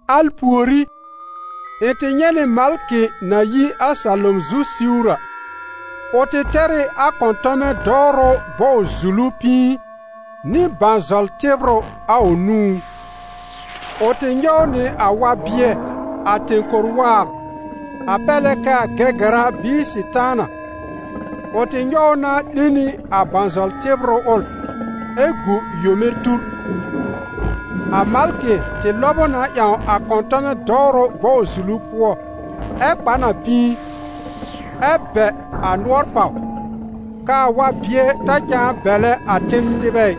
Al pùorí, ɩ̃ tɩ nyɛ̃ nɩ malkɩ na yi a salom zu siwr a; ʋ tɩ tɛr ɩ a kɔ̃tɔmɛ dɔwrʋ bɔw-zulu pĩi nɩ bãzɔl-tɩbrʋ a ʋ nũú. Ʋ tɩ nyɔw nɩ a wa-bɩɛ, a tẽ-kor waab, a pɛr lɛ k'aa Gɛgɛra bɩɩ Sɩtaana, ʋ tɩ nyɔw ʋ na 'lẽ nɩ a bãzɔl-tɩbrʋ ʋl, ɛ gu yome tur. A malkɩ tɩ lɔb ʋ na ƴãw a kɔ̃tɔmɛ dɔwrʋ bɔw-zulu pʋɔ, ɛ kpa n a pĩi, ɛ bɛ̀ a nʋɔr pàw, k'aa wa-bɩɛ ta cãa bɛlɛ a ten nɩbɛ ɩ,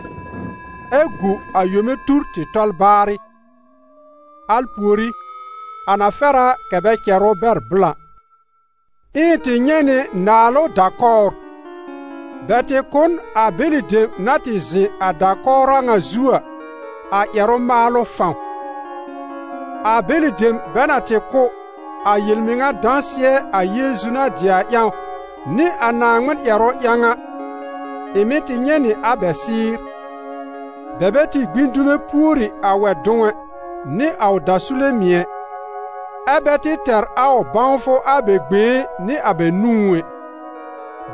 ɛ gu a yome tur tɩ tɔl baarɩ. Al pùorí, a na fɛr a kɛ̀ bɛ cɛr ʋ bɛr blã. Ɛ ɩ̃ tɩ nyɛ̃ nɩ naalʋ da-kɔwr: bɛ tɩ kʋ̀ n a bɛlɩ dem na tɩ zɩ̃ a da-kɔwr a ŋa zu a, a ƴɛrʋ-maalʋ fãw. A bɛlɩ dem bɛ na tɩ kʋ́, a yel-mɩŋa dãsɩɛ a Yeezu na dɩ a ƴãw nɩ a Naaŋmɩn ƴɛrʋ ƴãw a, ɩ̃ mɩ̀ tɩ nyɛ̃ nɩ a bɛ sɩɩ́r. Bɛ bɛ tɩ gbĩ dume pùori a wɛ-dʋ̃w ɛ, nɩ a ʋ dasule mɩ̀ ɛ, ɛ́ bɛ tɩ tɛ̀r a ʋ bãwfʋ a bɛ gbẽé nɩ a bɛ nũú ɛ.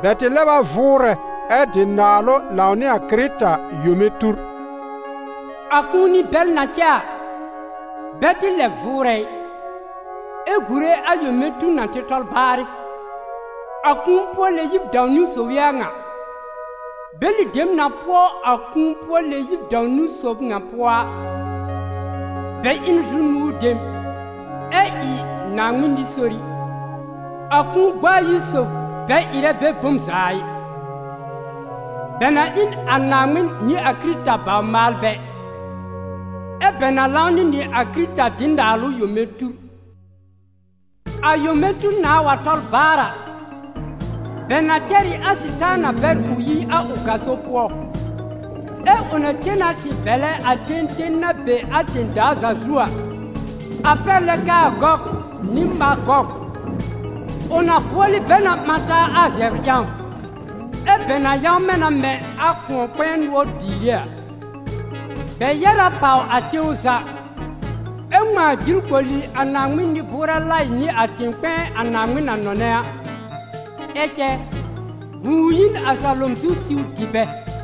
Bɛ tɩ lɛb a vʋʋrɛ ɛ dɩ naalʋ lãw nɩ a Kɩrɩta yome tur. A kũuni bɛl na cɛ a, bɛ tɩ lɛb vʋʋrɛ ɩ, ɛ gùre a yome tur na tɩ tɔl baarɩ. A kũu-pʋɔ-lɛ-yib dãw-niwn sob ɩ a ŋa. Bɛlɩ dem na pʋɔ a kũu-pʋɔ-lɛ-yib dãw-niwn sob ŋa pʋɔ a, bɛ ɩ n zu-nʋ̃ɔ dem ɛ ɩ Naaŋmɩn nɩ-sori. A kũu gb'a ayi sob bɛ ɩrɛ bɛ bom za ɩ: bɛ na ɩ n a Naaŋmɩn nɩ a Kɩrɩta bawr-maalbɛ, ɛ́ bɛ na lãw nɩ nɩ a Kɩrɩta dɩ naalʋ yome tur. A yome tur nãá wa tɔl baar a, bɛ na cɛr ɩ a Sɩtaana bɛr ʋ yi a ʋ gaso pʋɔ, ɛ́ ʋ na cen na tɩ bɛ̀lɛ a ten ten na be a tẽ-daa za zu a, a pɛr lɛ k'aa Gɔg nɩ Magɔg. Ʋ na bʋɔlɩ bɛ na ɓã taa a zɛbr ƴãw, ɛ́ bɛ na yãwmɛ na mɛ̃ a kʋ̃ɔ-kpɛ̃ɛ nʋɔr biire a. Bɛ yɛ́r a pàw a tẽw za, ɛ ŋmãa jil koli a Naaŋmɩn nɩ-bʋʋrɛ laɩ nɩ a tẽ-kpɛ̃ɛ a Naaŋmɩn na nɔnɛ a. Ɛ cɛ, vũu yi n a salom zu siw dɩ bɛ.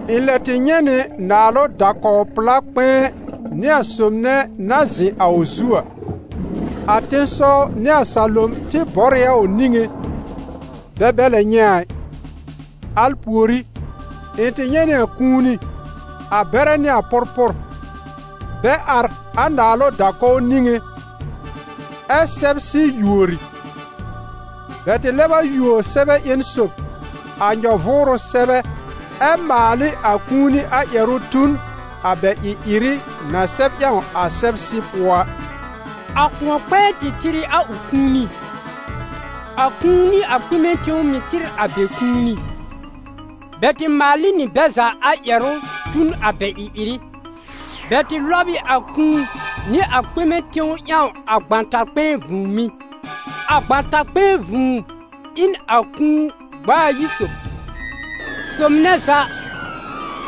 Ɩ̃ lɛ tɩ nyɛ̃ nɩ naalʋ da-kɔw-pla kpɛ̃ɛ nɩ a sob nɛ na zɩ̃ a ʋ zu a. A tẽsɔw nɩ a salom tɩ bɔr ɩ a ʋ niŋé, bɛ bɛ lɛ nyɛ̃ a ɩ. Al pùorí, ɩ̃ tɩ nyɛ̃ nɩ a kũuni, a bɛrɛ nɩ a pʋrpʋr, bɛ ar a naalʋ da-kɔw niŋé, ɛ́ sɛbsɩ yùori. Bɛ tɩ lɛb a yùo sɛbɛ ƴẽn sob, a nyɔ-vʋʋrʋ sɛbɛ, ɛ maal ɩ a kũuni a ƴɛrʋ tu n a bɛ ɩ-ɩrɩ na sɛb ƴãw a sɛbsɩ pʋɔ a. A kʋ̃ɔ-kpɛ̃ɛ tɩ tɩr ɩ a ʋ kũuni, a kũu nɩ a kpɩmɛ tẽw mɩ̀ tɩr a bɛ kũuni: bɛ tɩ maal ɩ nɩ bɛ za a ƴɛrʋ tu n a bɛ ɩ-ɩrɩ. Bɛ tɩ lɔb ɩ a kũu nɩ a kpɩmɛ tẽw ƴãw a gbãtar-kpɛ̃ɛ vũùmí. A gbãtar-kpɛ̃ɛ vũu ɩ n a kũu-gb'a-ayi sob. Sob nɛ za,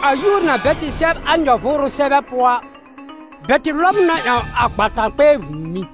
a yúor na bɛ tɩ sɛb a nyɔ-vʋʋrʋ sɛbɛ pʋɔ a, bɛ tɩ lɔb ʋ na ƴãw a gbãtar-kpɛ̃ɛ vũùmí.